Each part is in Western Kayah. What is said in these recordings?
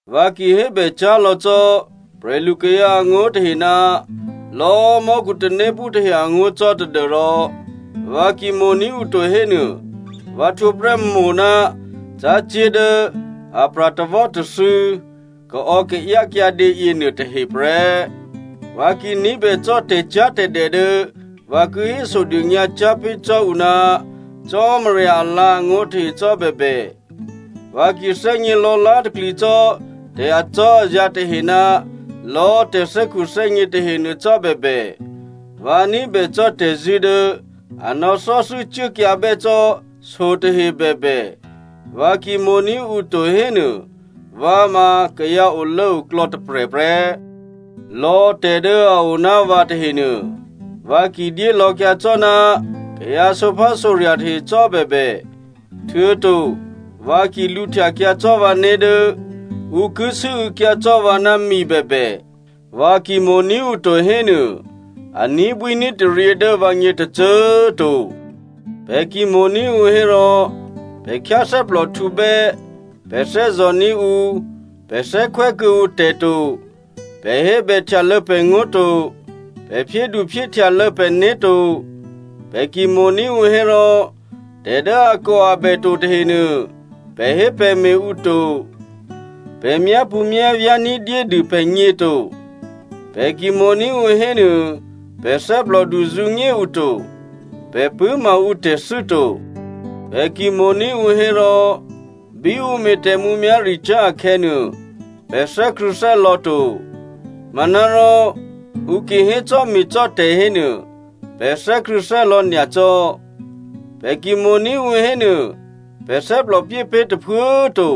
Vǎ ki hébècyá̤ lò̌ cò́ prè̤lukayǎ angó̤ tahe ná lò̌꤮ mò́khu tanéphú tahe angó̤ cò́ tadû́rò vǎ ki mo̤ní̤ ǔ to hénuô, vǎ htwǒ prè́ mo̤ ná cácé̤ dố apra̤ tawò́tathû̌ kaò̌kaáyá kyǎdě yěnuôtahe prè́. Vǎ ki ní̤bè cò́ tè̤cyá̤tè̤dè dố vǎ ki hésodônyǎ cyá̤ pé̤ cò́ ǔ ná Cò́marya alǎ̤angó̤ tahe cò́ bèbè, vǎ ki thè́gně lò̌lá̤takli cò́ tè̤ acò́azǎ̤ tahe ná lò̌꤮ tè̤thè́khuthè́gně tahenuô cò́ bèbè, vǎ ní̤bè cò́ tè̤zṳ̂́ dố a nò̌thò́thû́ cuốkyǎbè́ cò́ so tahe bèbè, vǎ ki mo̤ní̤ ǔ to hénuô, vǎ ma kayǎ olốoklò̌ tôprè̤ prè́. Lò̌ tè̤ dố a o ná vǎ tahenuô, vǎ ki dyé lò̌kyǎ cò́ ná kayǎ sǒphásǒrya̤ tahe cò́bèbè, htuô̌to vǎ ki lǔhtyakyǎ cò́ vǎné̤ dố ǔ ki sû́û̌kyǎ cò́ vǎ ná mi bèbè, vǎ ki mo̤ní̤ ǔ to hénuô, a ní̤bwíní̤taryě dố vǎgně tôcô꤮ to. Pè̤ ki mo̤ní̤ ǔ hérò, pè̤ khyáthè́plòhtǔbè́, pè̤ thè́zò̤ní̤ ǔ, pè̤ thè́khwè́ kuô̌ǔ tè̤ to, pè̤ hébèhtyalô̌ pè̤ngó̤ to, pè̤ phyédu phyéhtyalô̌ pè̤né̤ to. Pè̤ ki mo̤ní̤ ǔ hérò tè̤ dố akòabè to tahenuô pè̤hépè̤me̤ ǔ to. Pè̤ myápṳ̌myávyá̤ ní̤dyédû pè̤gně to. Pè̤ ki mo̤ní̤ ǔ hénuô pè̤ thè́plòdu zǔnyé ǔ to. Pè̤ pṳ̂́ma ǔtè̤thû́ to. Pè̤ ki mo̤ní̤ ǔ hérò, bí ǔ me̤ tè̤mǔmyá̤ricyá̤ akhè̌nuô, pè̤ thè́krṳ̂̌thè́lò̌ to, manárò ǔ ki hécò́me̤cò́ tè̤ hénuô, pè̤ thè́krṳ̂̌thè́lò̌ nyacò́. Pè̤ ki mo̤ní̤ ǔ hénuô, pè̤ thè́plò pyé pé̤ tôphuố꤮ to.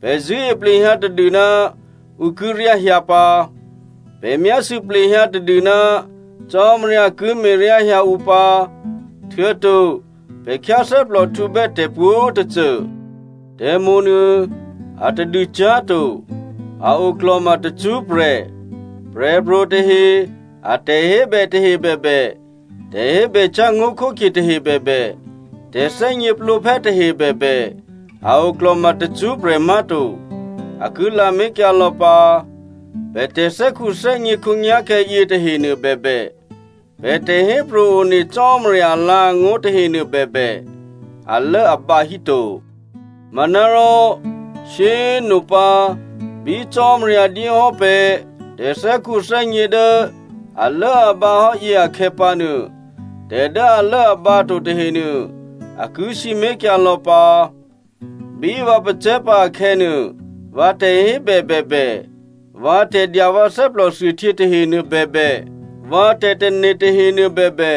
Pè̤ zṳ̂́e plehyǎ tadû ná ǔ ki ryá hyǎ pǎ, pè̤ myásû̌ plehyǎ tadû ná Cò́marya ki me̤ryá hyǎ ǔ pǎ, htuô̌to pè̤ khyáthè́plòhtǔbè́ tè̤pwǒ̤tôcô. Tè̤mo̤nuô atadû cyá̤to, a oklò̤ma tacṳ́prè̤. Prè̤pro̤ tahe a tè̤hébè tahe bèbè, tè̤hébècyá̤ ngó̤khókhye tahe bèbè, tè̤thè́gněplǒphè́ tahe bèbè, a o klò̤ma tacṳ́prè̤ má̤to, a ki lamé̤kyǎ lò̌ pǎ. Pè̤ tè̤thè́khuthè́gně khǒnyá̤khè̌ yětahenuô bèbè, pè̤ tè̤hépro̤ one Cò́marya alǎ̤angó̤ tahenuô bèbè alốabǎ hí to. Manárò shyé꤮ nopǎ bí Cò́marya dyé hò́ pè̤ tè̤thè́khuthè́gně dố alốabǎhò́ yě akhè̌pǎnuô, tè̤ dố alốabǎ to tahenuô a ki sǐmé̤kyǎ lò̌ pǎ. Bí vǎ pacè̤̌ pǎ akhè̌nuô, vǎ tè̤hébè bèbè, vǎ tè̤dya vǎ thè́plòthuôhtyě tahenuô bèbè, vǎ tè̤tane̤ tahenuô bèbè,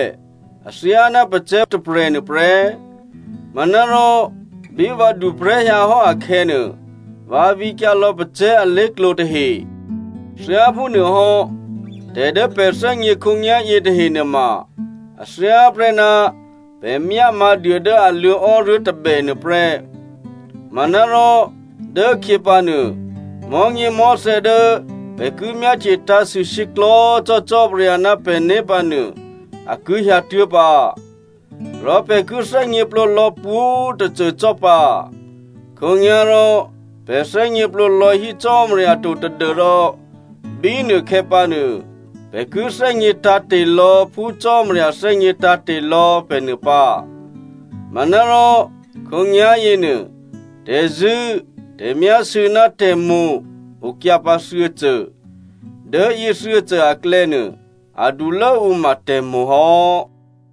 athyáná pacè̤̌ tôprè̤nuô prè́. Manárò bí vǎ duprè̤́ hyǎ hò́ akhè̌nuô, vǎ vǐkyǎ lò̌ pacè̤̌ alé̤klǒ tahe. Thyáphúnuôhò́ tè̤ dố pè̤ thè́gně khǒnyá̤yě tahe nuôma a thyáprè́ ná pè̤ myá mǎ̤duô dố a luô̌ ò́ruố̤ tôbè nuô prè́. Manárò dố khyě pǎnuô mò̤́nyěmò̤́thè̌ dố pè̤ ki myáhtye tǎ̤sû shyěklò̤́ cò́ Cò́marya ná pè̤né̤ pǎ nuô, a ki hyǎtuố̤ pǎ, rò pè̤ ki thè́gněplǒ lò̌ pwǒ̤꤮ tôcô cò́ pǎ. Khǒnyá̤rò pè̤ thè́gněplǒ lò̌ hí Cò́marya to tadû́rò bínuôkhè̌ pǎ nuô, pè̤ ki thè́gně tǎ̤te̤ lò̌ phú Cò́marya thè́gně tǎ̤te̤ lò̌ pè̤ nuô pǎ. Manárò khǒnyá̤ yěnuô, tè̤zṳ̂́, tè̤myásû̌ ná tè̤mo̤ okyǎ pǎ thuô̌cô. Dố yě thuô̌cô aklè̌nuô adulố ǔ ma tè̤mo̤ hò́.